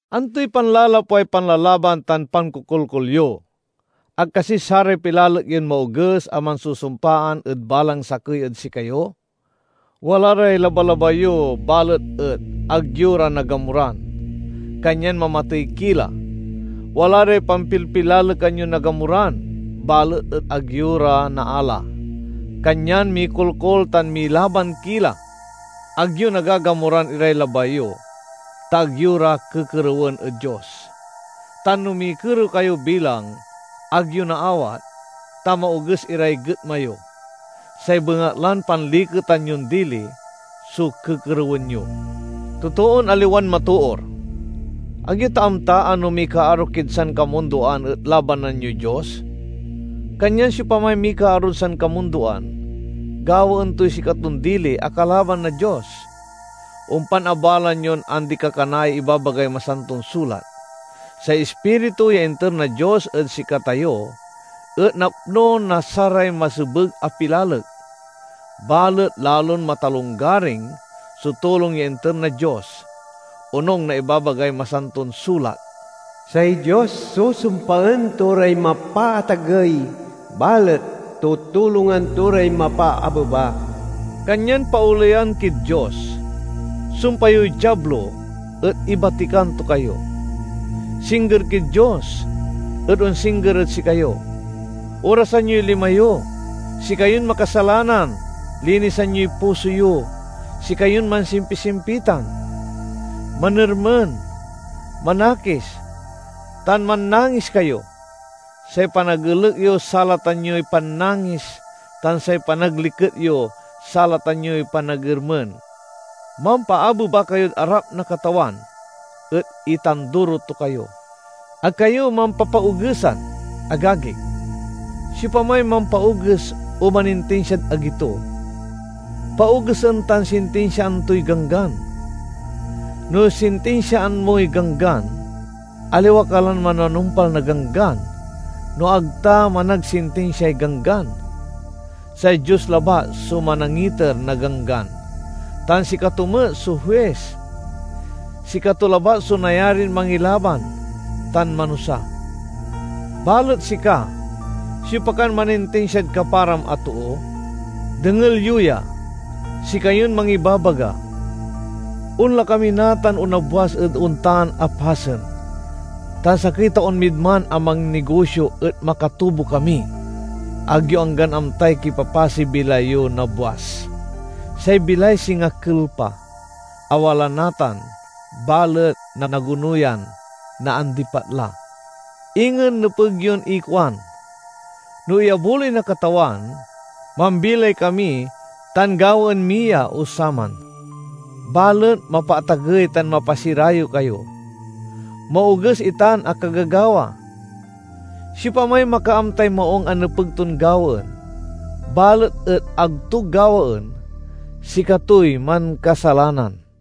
Antoy panlalapway panlalaban tan pankokolkol yo? Ag kasi saray pilalek yon maoges a mansusumpaan ed balang sakey ed sikayo? Wala ray labalabay yo balet et ag yo ra nagamuran, kanyan mamatey ki la; wala ray pampilpilalekan yon nagamuran balet et ag yo ra naala, kanyan mikolkol tan milaban ki la. Ag yo nagagamuran iray labay yo, ta ag yo ra kekerewen ed Dios. Tan no mikerew kayo bilang ag yo naawat, ta maoges iray getma yo; say bengatlan panliketan yon dili so kekerewen yo. Totoon aliwan matoor! Ag yo ta amta a no mikaaro kid sankamundoan et labanan yoy Dios? Kanyan siopamay mikaarod sankamundoan, gawaen toy sikaton dili a kalaban na Dios. Ompan abaloan yon andi-kakanaay ibabagay Masanton Sulat: "Say Ispiritu ya inter na Dios ed sikatayo et napno na saray masebeg a pilalek." Balet lalon matalonggaring so tulong ya inter na Dios. Onung na ibabagay Masanton Sulat, "Say Dios susumpaen to ray mapaatagey, balet tutulongan to ray mapaabeba." Kanyan paoleyan kid Dios. Sumpa yoy Diablo et ibatikan to kayo. Singger kid Dios, et onsingger ed sikayo. Orasan yoy lima yo, sikayon makasalanan! Linisan yoy puso yo, sikayon mansimpisimpitan! Manermen, manakis, tan mannangis kayo; say panagelek yo salatan yoy pannangis tan say panagliket yo salatan yoy panagermen! Mampaabeba kayod arap na Katawan et itanduro to kayo. Ag kayo mampapaogesan, agagik. Siopamay mampaoges o manintinsiad agi to, paogesen tan sintinsiaan toy Ganggan. No sintinsiaan moy Ganggan, aliwa ka lan mananumpal na Ganggan no ag ta managsintinsiay Ganggan. Say Dios labat so manangiter na Ganggan, tan sikato met so huis. Sikato labat so nayarin mangilaban, tan manusa. Balet sika—siopa kan manintinsiad kaparam a too? Dengel yo ya, sikayon mangibabaga, "Onla kami natan o nabwas ed ontan a pasen, tan sakey taon mid man a mannigosio et makatubo kami." Ag yo anggan amtay kipapasey bilay yo nabwas! Say bilay singa kelpa, a wala natan balet nanagonuyan naandipat la. Ingen nepeg yon ikuan, "No iyabuloy na Katawan, mambilay kami tan gawaen mi ya o saman." Balet mapaatagey tan mapasirayew kayo. Maoges itan a kagagawa. Siopamay makaamtay maung a nepeg ton gawaen, balet et ag to gawaen, sikatoy mankasalanan.